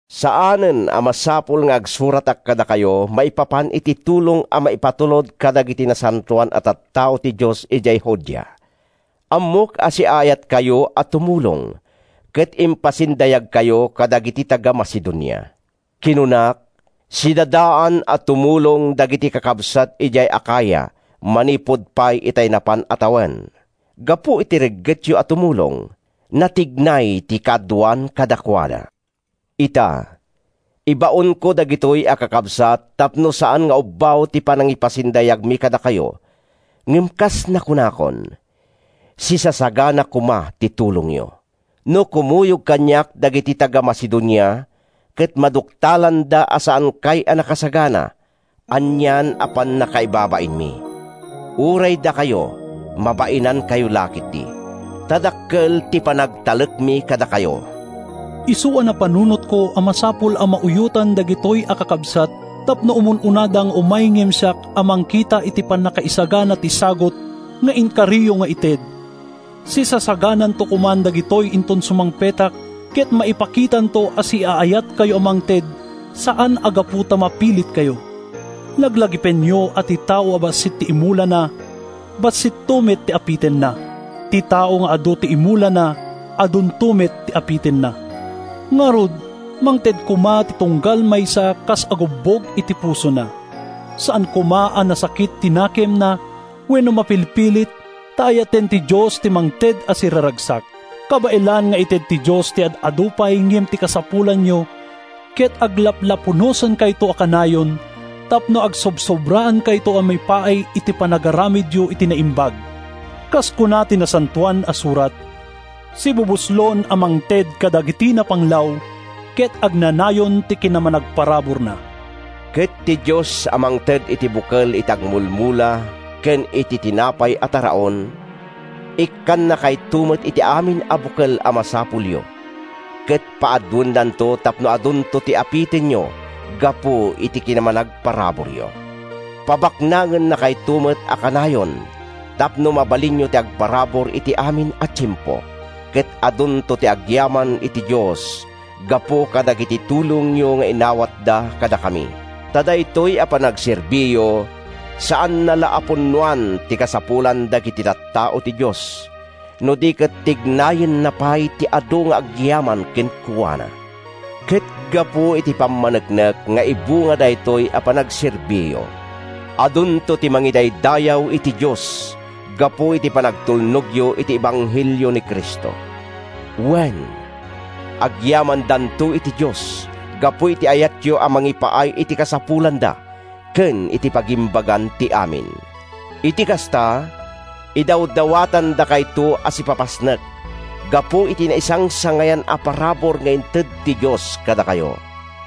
Saanen a masapul nga agsuratak kadakayo maipapan iti tulong a maipatulod kadagiti nasantoan a tattao ti Dios idiay Judea. Ammok a siaayatkayo a tumulong, ket impasindayagkayo kadagiti taga-Macedonia. Kinunak, “Sidadaan a tumulong dagiti kakabsat idiay Acaya manipud pay itay napan a tawen.” Gapu iti reggetyo a tumulong, natignay ti kaaduan kadakuada. Ita, ibaonko dagitoy a kakabsat tapno saan nga ubbaw ti panangipasindayagmi kadakayo ngem kas nasaokon, sisasagana koma ti tulongyo. No kumuyog kaniak dagiti taga-Macedonia ket maduktalanda a saankay a nakasagana, anian a pannakaibabainmi—uray dakayo mabainankayo la ketdi—ta dakkel ti panagtalekmi kadakayo! Isu a napanunotko a masapul a mauyotan dagitoy a kakabsat tapno umun-unada nga umay ngem siak a mangkita iti pannakaisagana ti sagut nga inkariyo nga ited. Sisasagananto koman dagitoy inton sumangpetak, ket maipakitanto a siaayatkayo a mangted saan a gapu ta mapilitkayo. Laglagipenyo a ti tao a bassit ti imulana, bassitto met ti apitenna. Ti tao nga adu ti imulana, adunto met ti apitenna. Ngarud, mangted koma ti tunggal maysa kas agubbog iti pusona. Saan koma a nasakit ti nakemna wenno mapilpilit, ta ayaten ti Dios ti mangted a siraragsak. Kabaelan nga ited ti Dios ti ad-adu pay ngem ti kasapulanyo ket aglaplapunosankayto a kanayon tapno agsobsobraankayto a maipaay iti panagaramidyo iti naimbag. Kas kuna ti Nasantoan a Surat: “Sibubuslon a mangted kadagiti napanglaw, Ket agnanayon ti kinamanagparaburna.” Ket ti Dios a mangted iti bukel iti agmulmula ken iti tinapay a taraon, ikkannakayto met iti amin a bukel a masapulyo ket paaduennanto tapno adunto ti apitenyo gapu iti kinamanagparaburyo. Pabaknangennakayto met a kanayon tapno mabalinyo ti agparabur iti amin a tiempo, ket adunto ti agyaman iti Dios gapu kadagiti tulongyo nga inawatda kadakami. Ta daytoy a panagserbiyo, saanna la a punnoan ti kasapulan dagiti tattao ti Dios, no di ket tignayenna pay ti adu nga agyaman kenkuana. Ket gapu iti pammaneknek nga ibunga daytoy a panagserbiyo, adunto ti mangidaydayaw iti Dios gapu iti panagtulnogyo iti ebanghelio ni Cristo. Wen, agyamandanto iti Dios gapu iti ayatyo a mangipaay iti kasapulanda ken iti pagimbagan ti amin. Iti kasta, idawdawatandakayto a sipapasnek gapu iti naisangsangayan a parabur nga inted ti Dios kadakayo.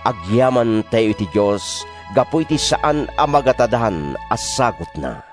Agyamantayo iti Dios gapu iti saan a magatadan a sagutna!